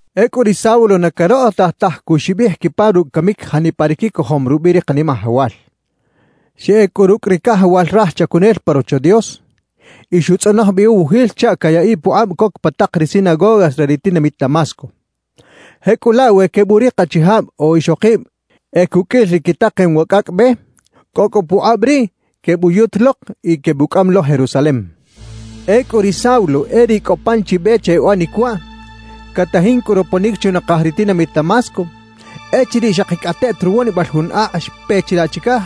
Ecꞌu ri Saulo na carokꞌotaj taj cuxibij quipa rucꞌ camic janipa ri quicojom rubiꞌ ri Kanimajawal. Xeꞌec cꞌu rucꞌ ri cajawal raj chacunel pa Rocho Dios y xutzꞌonoj bi uwujil chaꞌ cayaꞌiꞌ pukꞌab coc pa tak ri sinagogas re ri tinamit Damasco. Jecꞌulaꞌ, we queburik achijab o ixokib e cuqꞌuil ri quitakem wa cꞌacꞌ Be, cꞌo cꞌu pukꞌab riꞌ quebuyut lok y quebucꞌam lo Jerusalem. Ecꞌu ri Saulo e riꞌ cꞌo pan chi be che uꞌanic waꞌ, catajin cꞌu roponic chunakaj ri tinamit Damasco, echiriꞌ xakicꞌateꞌt ruwonibal jun akꞌ xpe chilaꞌ chicaj,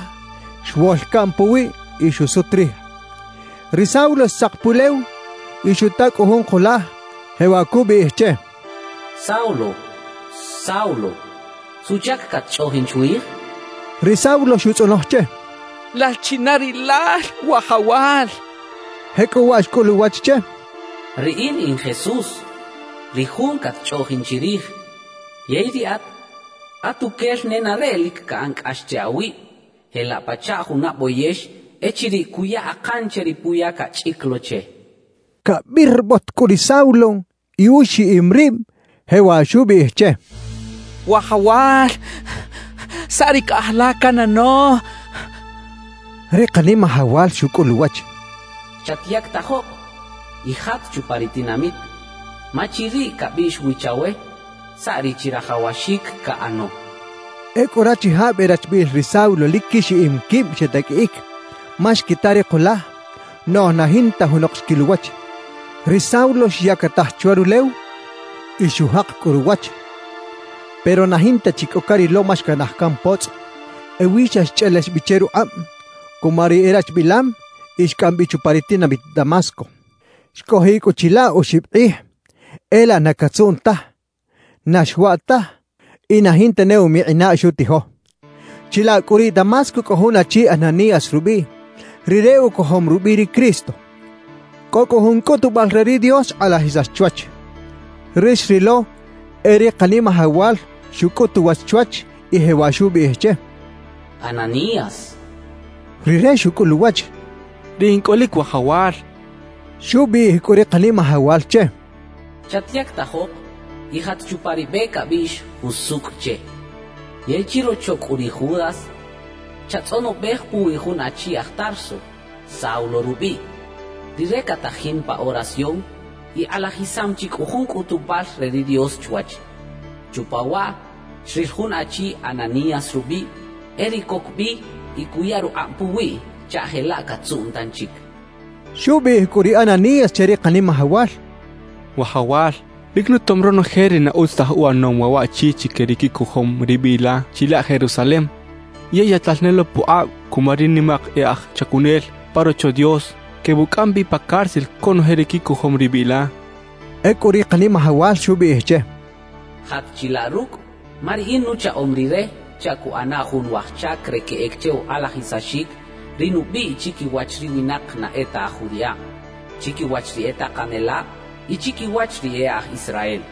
xwol caꞌn puwiꞌ y xusut rij. Ri Saulo xtzak pulew y xuta cꞌu jun kulaj, jewaꞌ cubiꞌij che: —Saulo, Saulo, ¿suꞌchac catchꞌoꞌjin chwij? —xcha che. Ri Saulo xutzꞌonoj che: —¿Lal china rilal, Wajawal? —xchaꞌ. Jecꞌuwaꞌ xcꞌul uwach che: —Riꞌin in Jesús, ri Jun catchꞌoꞌjin chirij. Yey riꞌat, atuquel nenareꞌ lic caꞌan cꞌax che awib, jelaꞌ pachaꞌ juna boyex echiriꞌ cuya akan che ri puya cachꞌic lo che —xuchixic. Cabirbot cꞌu ri Saulo y uxiꞌim rib, jewaꞌ xubiꞌij che: —Wajawal, ¿saꞌ ri caꞌaj la canꞌano? —xchaꞌ. Ri Kanimajawal xucꞌul uwach: —Chatyactajok y jat chupa ri tinamit, ma chiriꞌ cabiꞌx wi chawe saꞌ ri chirajawaxic caꞌano —xchaꞌ. Ecꞌu rachijab e rachbiꞌil ri Saulo lic quixiꞌim quib xetaqꞌuiꞌic; ma xquita ri kulaj, noꞌj na jinta junok xquil uwach. Ri Saulo xyactaj chwa rulew y xujak cꞌu ruwach, pero na jinta chi cꞌo carilo ma xcanaj can potzꞌ. Ewi xa xchꞌelex bi che rukꞌab cuma ri erachbilam y xcꞌam bi chupa ri tinamit Damasco. Xcꞌojiꞌ cꞌu chilaꞌ oxib kꞌij; e laꞌ na catzuꞌn taj, na xwaꞌ taj y na jinta ne umikꞌinaꞌ xutijo. Chilaꞌ cꞌu riꞌ Damasco cꞌo jun achi Ananías rubiꞌ; rire ucojom rubiꞌ ri Cristo. Cꞌo cꞌu jun cꞌutubal re ri Dios xkꞌalajisax chwach. Ri xrilo e ri Kanimajawal xucꞌut uwach chwach y jewaꞌ xubiꞌij che: —¡Ananías! —xcha che. Rire xucꞌul uwach: —Riꞌ in cꞌolic, Wajawal —xchaꞌ. Xubiꞌij cꞌu ri Kanimajawal che: —Chatyactajok y jat chupa ri be cabiꞌx “Jusucꞌ” che. Yey chirocho cꞌu ri Judas, chatzꞌonobej puwi jun achi aj Tarso, Saulo rubiꞌ. Rire catajin pa oración y kꞌalajisam chi cꞌu jun cꞌutubal re ri Dios chwach. Chupa waꞌ xril jun achi Ananías rubiꞌ, e riꞌ coc bi y cuya rukꞌab puwiꞌ chaꞌ jelaꞌ catzuꞌn tanchic —xchaꞌ. Xubiꞌij cꞌu ri Ananías che ri Kanimajawal: —Wajawal, lic nutom ronoje ri na utz taj uꞌanom waꞌ waꞌchi chique ri quicojom ri biꞌ la chilaꞌ Jerusalem. Yey yaꞌtal ne lo pukꞌab cuma ri nimak e aj chacunel pa Rocho Dios quebucꞌam bi pa cárcel conoje ri quicojom ri biꞌ la —xchaꞌ. Ecꞌu ri Kanimajawal xubiꞌij che: —Jat chilaꞌ rucꞌ, ma Riꞌin nuchaꞌom rire chaꞌ cuꞌana jun waj chac re queꞌec che ukꞌalajisaxic ri nubiꞌ chiquiwach ri winak na e ta aj judiꞌab, chiquiwach ri e takanelab y chiquiwach ri e aj Israel.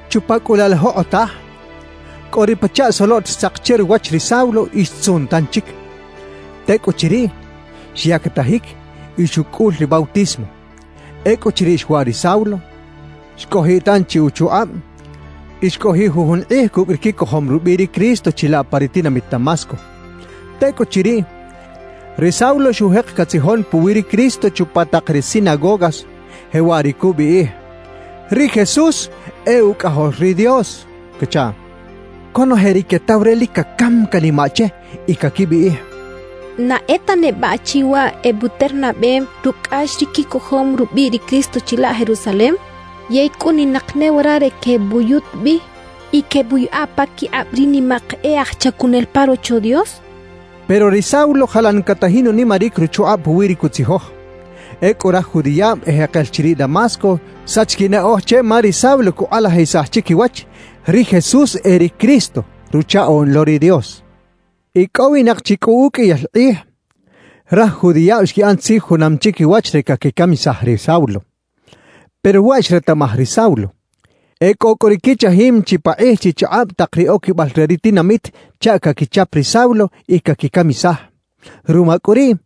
Chupa cꞌu laꞌ la jokꞌotaj, cꞌo ri pachaꞌ soloꞌt xtzak che ruwach ri Saulo y xtzuꞌn tanchic. Tecꞌuchiriꞌ, xyactajic y xucꞌul ri bautismo. Ecꞌuchiriꞌ xwaꞌ ri Saulo, xcꞌojiꞌ tanchi uchukꞌab y xcꞌojiꞌ jujun kꞌij cucꞌ ri quicojom rubiꞌ ri Cristo chilaꞌ pa ri tinamit Damasco. Tecꞌuchiriꞌ, ri Saulo xujek catzijon puwi ri Cristo chupa tak ri sinagogas, jewaꞌ ri cubiꞌij: «Ri Jesús e Ucꞌajol ri Dios» cachaꞌ. Conoje ri quetaw re lic cacam canimaꞌ che y caquibiꞌij: «¿Na e ta neba achi waꞌ ebuternabem rucꞌ cꞌax ri quicojom rubiꞌ ri Cristo chilaꞌ Jerusalem; yey cꞌuninak ne wara re quebuyut bi y quebuꞌyaꞌa paquikꞌab ri nimak e aj chacunel pa Rocho Dios?» quechaꞌ. Pero ri Saulo jalan catajin unimaric ruchukꞌab puwi ri cutzijoj. Ecꞌu raj judiꞌab ejekel chiriꞌ Damasco xsach quinaꞌoj che ma ri Saulo cukꞌalajisaj chiquiwach: Ri Jesús e ri Cristo, Ruchaꞌoꞌn lo ri Dios. Icꞌowinak chi cꞌu uqꞌuiyal kꞌij, raj judiꞌab xquiꞌan tzij junam chiquiwach re caquicamisaj ri Saulo. Pero waꞌ xretaꞌmaj ri Saulo. Ecꞌo cꞌu ri quichajim chipakꞌij chichakꞌab tak ri oquibal re ri tinamit chaꞌ caquichap ri Saulo y caquicamisaj. Ruma cꞌu riꞌ,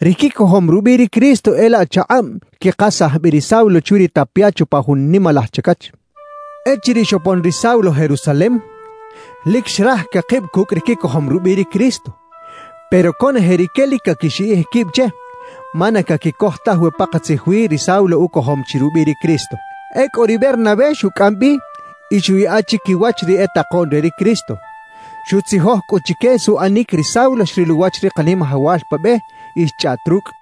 ri quicojom rubiꞌ ri Cristo e laꞌ chakꞌab xquikasaj bi ri Saulo chwi ri tapia chupa jun nimalaj chacach. Echiriꞌ xopon ri Saulo Jerusalem, lic xraj cakib cucꞌ ri quicojom rubiꞌ ri Cristo. Pero conoje rique lic caquixiꞌij quib che, ma na caquicoj taj we pakatzij wi ri Saulo ucojom chi rubiꞌ ri Cristo. Ecꞌu ri Bernabé xucꞌam bi y xuꞌyaꞌa chiquiwach ri e takoꞌn re ri Cristo. Xutzijoj cꞌu chique suꞌanic ri Saulo xril uwach ri Kanimajawal pa be y xchꞌaꞌt rucꞌ.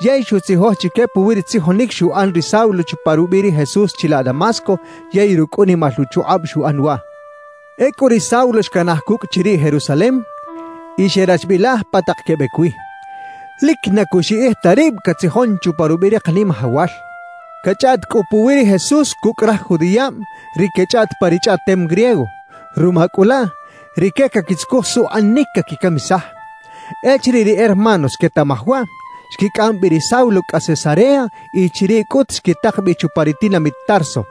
Yey xutzijoj chique puwi ri tzijonic xuꞌan ri Saulo chupa rubiꞌ ri Jesús chilaꞌ Damasco yey rucꞌ unimal uchukꞌab xuꞌan waꞌ. Ecꞌu ri Saulo xcanaj cucꞌ chiriꞌ Jerusalem y xerachbilaj pa tak quebec wi. Lic na cuxiꞌij ta rib catzijon chupa rubiꞌ ri Kanimajawal. Cachꞌaꞌt cꞌu puwi ri Jesús cucꞌ raj judiꞌab ri quechꞌaꞌt pa ri chꞌaꞌtem griego; ruma cꞌu laꞌ, rique caquitzucuj suꞌanic caquicamisaj. Echiriꞌ ri hermanos xquetaꞌmaj waꞌ, xquicꞌam bi ri Saulo cꞌa Cesarea y chiriꞌ cꞌut xquitak bi chupa ri tinamit Tarso.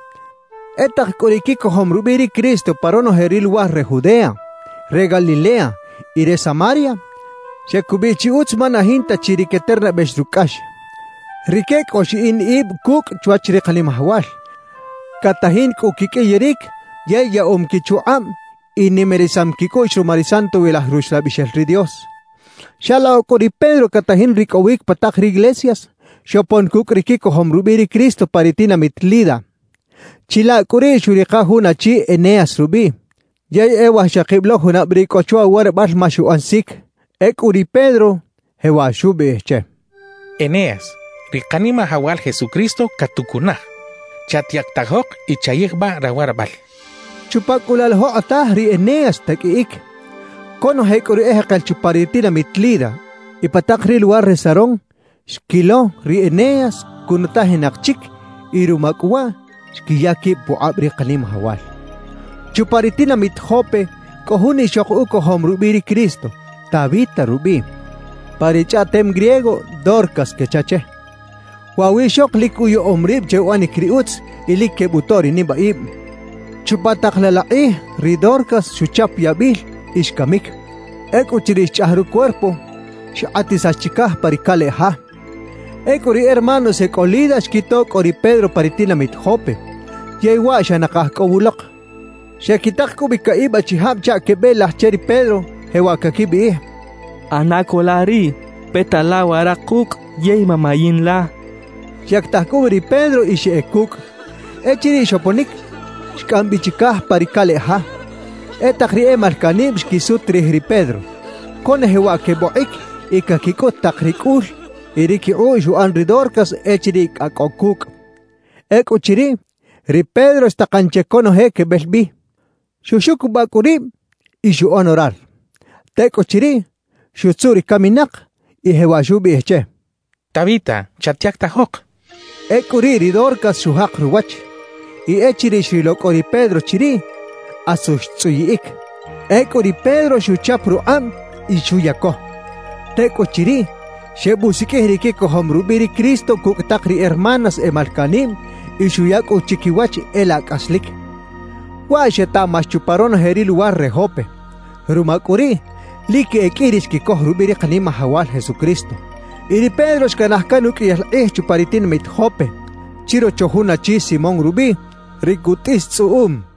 E tak cꞌu ri quicojom rubiꞌ ri Cristo pa ronoje ri luwar re Judea, re Galilea y re Samaria, xecubiꞌ chi utz ma na jinta chi ri queternabex rucꞌ cꞌax. Rique cꞌo xiꞌin ib cucꞌ chwach ri Kanimajawal. Catajin cꞌu quiqꞌuiyaric yey yaꞌom quichukꞌab y nimarisam quicꞌuꞌx ruma ri Santowilaj Ruxlabixel ri Dios. Xalokꞌ cꞌu ri Pedro catajin ricꞌowic pa tak riglesias, xopon cucꞌ ri quicojom rubiꞌ ri Cristo pa ri tinamit Lida. Chilaꞌ cꞌu riꞌ xuꞌrika jun achi Eneas rubiꞌ, yey e wajxakib lo junab riꞌ cꞌo chwa uwarabal ma xuꞌan sic. Ecꞌu ri Pedro jewaꞌ xubiꞌij che: «Eneas, ri Kanimajawal Jesucristo catucunaj. Chatyactajok y chayijbaꞌ rawarabal» xcha che. Chupa cꞌu laꞌ la jokꞌotaj ri Eneas xtaqꞌuiꞌic. Conoje cꞌu ri ejekel chupa ri tinamit Lida y pa tak ri luwar re Sarón xquilo ri Eneas cunutajinak chic; y ruma cꞌu waꞌ, xquiya quib pukꞌab ri Kanimajawal. Chupa ri tinamit Jope cꞌo jun ixok ucojom rubiꞌ ri Cristo, Tabita rubiꞌ. (Pa ri chꞌaꞌtem griego “Dorcas” quecha che.) Waꞌ wiꞌxok lic uyaꞌom rib che uꞌanic ri utz y lic quebutoꞌ ri nibaꞌib. Chupa tak laꞌ la kꞌij ri Dorcas xuchap yabil y xcamic. Ecꞌuchiriꞌ xchꞌaj rucuerpo, xkꞌatisax chicaj pa ri caleꞌ ja. Ecꞌu ri hermanos e cꞌo Lida xquito cꞌo ri Pedro pa ri tinamit Jope, yey waꞌ xa nakaj cꞌo wulok. Xequitak cꞌu bi caꞌib achijab chaꞌ quebeꞌelaj che ri Pedro, jewaꞌ caquibiꞌij: «ꞌAna co la riꞌ, peta la wara kucꞌ yey mamayin la.» Xyactaj cꞌu bi ri Pedro y xeꞌec cucꞌ. Echiriꞌ xoponic, xcꞌam bi chicaj pa ri caleꞌ ja. E tak ri e malcaꞌnib xquisut rij ri Pedro. Conoje waꞌ quebokꞌic y caquicꞌut tak ri cꞌul y ri quikꞌuꞌ xuꞌan ri Dorcas echiriꞌ cꞌa cꞌo cucꞌ. Ecꞌuchiriꞌ, ri Pedro xtakan che conoje quebel bi. Xuxucubaꞌ cꞌu rib y xuꞌan orar. Tecꞌuchiriꞌ, xutzuꞌ ri caminak, y jewaꞌ xubiꞌij che: «¡Tabita, chatyactajok!» xchaꞌ. Ecꞌu riꞌ ri Dorcas xujak ruwach; y echiriꞌ xrilo cꞌo ri Pedro chiriꞌ, asu xtzꞌuyiꞌic. Ecꞌu ri Pedro xuchap rukꞌab y xuyaco. Tecꞌuchiriꞌ, xebusiqꞌuij ri quicojom rubiꞌ ri Cristo cucꞌ tak ri hermanas e malcaꞌnib, y xuya cꞌu chiquiwach e laꞌ cꞌaslic. Waꞌ xetaꞌmax chupa ronoje ri luwar re Jope. Ruma cꞌu riꞌ, lic e qꞌui ri xquicoj rubiꞌ ri Kanimajawal Jesucristo. Y ri Pedro xcanaj can uqꞌuiyal kꞌij chupa ri tinamit Jope, chirocho jun achi Simón rubiꞌ, ri cutꞌis tzꞌuꞌum.